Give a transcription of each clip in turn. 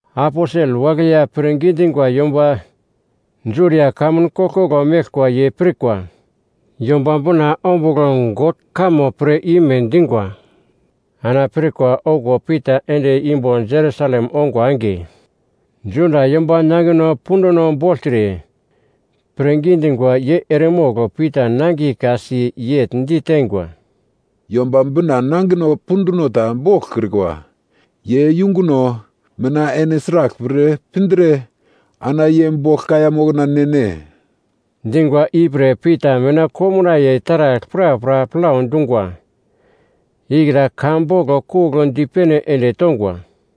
Aposel wagle ya pirngi dingwa yomba Judia kamun koglkoglo meglkwa ye pirkwa Yomba Bina ombugl God kamo pir ime dingwa. Ana pirkwa okuwo Pita ende imbo Jerusalem ongwa enge, Juda yomba nangino punduno bogltre pirngi dingwa ye eremogl Pita nangiye ka-si, yegl diteingwa, “Yomba Bina nangino punduno ta boglkrikwa ye yunguno mina ene sraglpre pindre ana ye bogl kaiya mokna ne-ne?” Dingwa ipre Pita mina komnaiye taragl prapra plau dungwa ikra ka boglo kugl dipene ende tongwa: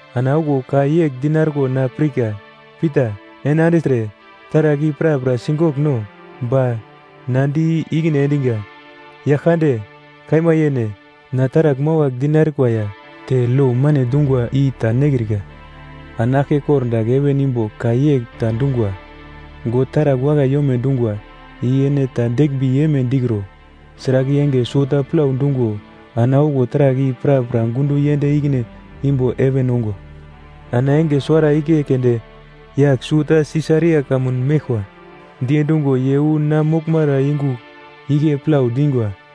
Ana okuwo ka yegl dinarko na pirka, ‘Pita, ene andigltre taragl i prapra sigogl no!’ “Ba na di ikine endinga, ‘Yaglkande! Kaima yene, na taragl mawagl dinarikwa ya te lo mane dungwa i ta nekrika.’ “Ana aglke kordagl heven imbo ka yegl ta dungwa, ‘God taragl wakai yome dungwa i ene ta deglmbi yeme dikro!’ Sragl i enge suwota plau dungo ana okuwo taragl i prapra gundo yend ikine imbo heven ongwa. “Ana enge suwara igle keunde, yagl suwota Sisaria kamun meglkwa diendingo ye wu na moglmara yungu igle plau dingwa.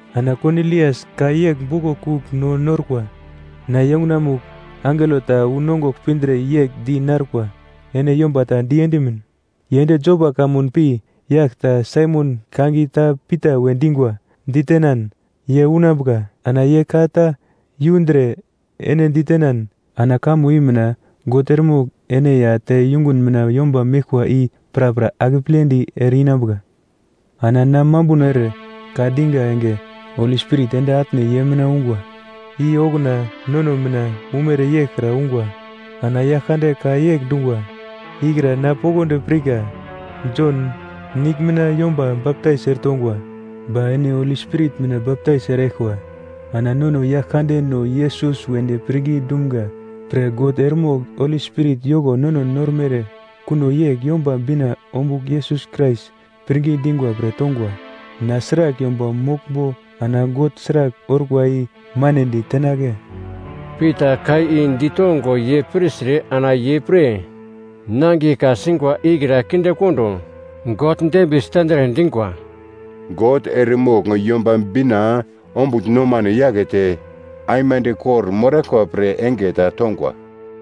Ana Konilias ka yegl boglo kugl no norkwa, ‘Na yungunamugl angelo ta unongugl pindre yegl di narkwa, “Ene yomba ta diendimin ye ende Jopa kamun pi yagl ta Saimon, kangiye ta Pita we dingwa, ditenan ye unambuka.” Ana ye ka ta yundre ene ditenan ana kamo i mina God eremogl ene ya te yungun mina yomba meglkwa i prapra akepledi ere-inambuka.’ “Ana na mambuno ere ka dinga enge Holi Spirit ende atne ye mina ungwa, i okuna nono mina umere yeglkra ungwa. Ana Yaglkande ka yegl dungwa ikra na poglodi pirka, ‘Jon nigl mina yomba baptais eretongwa, ba ene Holi Spirit mina baptais eraglkwa.’ Ana nono Yaglkandeno Yesus wedi pirngi dumga pre God eremogl Holi Spirit yoko nono normere kuno yegl Yomba Bina ombugl Yesus Krais pirngi dingwa pre tongwa. Na sragl yomba moglmbo ana God sragl orkwa i manedi tenagle?” Pita ka i ditongo ye pirtre ana ye pre nangiye ka-singwa ikra kindekondo God dembiye sitendre dingwa, “God eremogl Yomba Bina ombugl nomano yakete aimande kor-moraglkwa pre enge ta tongwa.”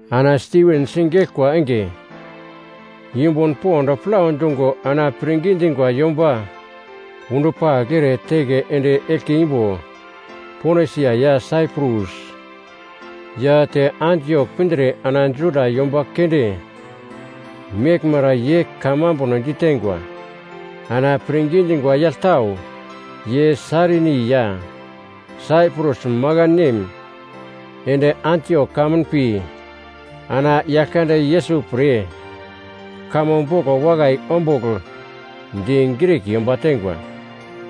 Ana Stiven sigeglkwa enge yumbun pond plau dungo ana pirngi dingwa yomba undupagl ere teke ende eglke imbo Ponisia ya Saiprus ya te Antiok pindre ana Juda yomba keunde meglmara ye ka mambuno diteingwa. Ana pirngi dingwa yagl tau ye Sairini ya Saiprus makan nem ende Antiok kamun pi ana Yaglkande Yesus pre kamo boglo wakai ombugl di Grik yomba teingwa.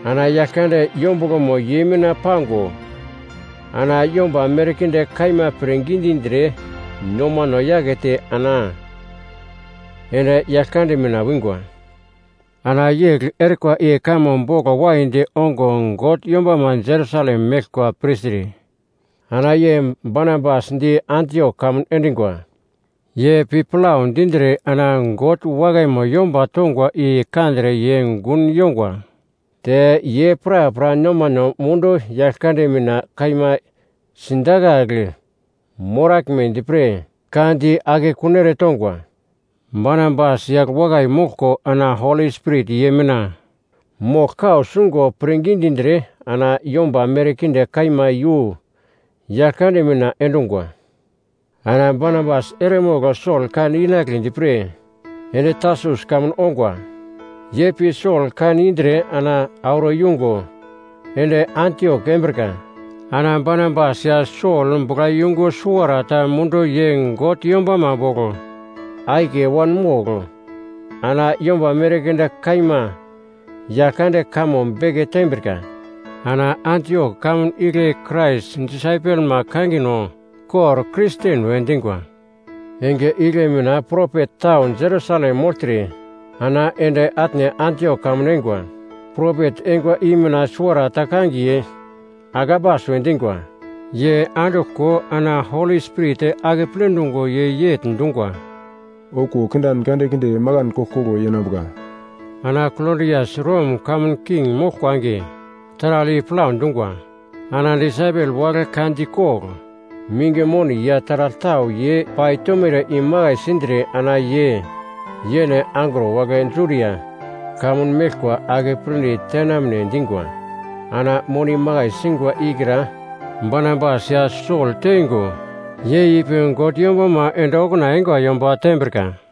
Ana Yaglkande yombuglomo ye mina pango ana yomba merkinde kaima pirngi dindre nomano yakete ana ende Yaglkande mina wingwa. Ana yegl erikwa i kamo boglo waidi ongo God yombama Jerusalem meglkwa pirtre ana ye Barnabas di Antiok kamun endingwa. Ye pi plau dindre ana God wakaimo yomba tongwa i kandre ye gun yongwa, te ye prapra nomano mundu Yaglkande mina kaima sidakagl moraglmedi pre ka di akekun eretongwa. Barnabas yagl wakai moglko ana Holi Spirit ye mina mogl kau sungo pirngi dindre ana yomba merkinde kaima iyu Yaglkande mina endungwa. Ana Barnabas eremogl Sol kan inagledi pre ende Tarsus kamun ongwa. Ye pi Sol kan indre ana auro yungo ende Antiok embrika. Ana Barnabas ya Sol buglayungu suwarata mundu ye God yombama bogl akiye wanmogl ana yomba merkinde kaima Yaglkande kamo beke tembrika. Ana Antiok kamun igle Krais disaipelma kangino kor Kristen we dingwa. Enge igle mina propet tau Jerusalem mogltre ana ende atne Antiok kamun eingwa. Propet eingwa i mina suwarata kangiye Agabas we dingwa, ye anduglko ana Holi Spirit akeple dungo ye yegl dungwa, “Okuwo kindan kandekinde makan koglkoglo yenambuka.” (Ana Klodias Rom kamun king moglkwa enge taragl i plau dungwa.) Ana disaipel wagle ka dikogl minge moni ya taragl tau ye paitomere imakai sindre ana ye yene angro wagle Judia kamun meglkwa akepledi tenamne dingwa. Ana moni makai singwa ikra Barnabas ya Sol teingo ye ipi God yombama ende okuna eingwa yomba tembrika.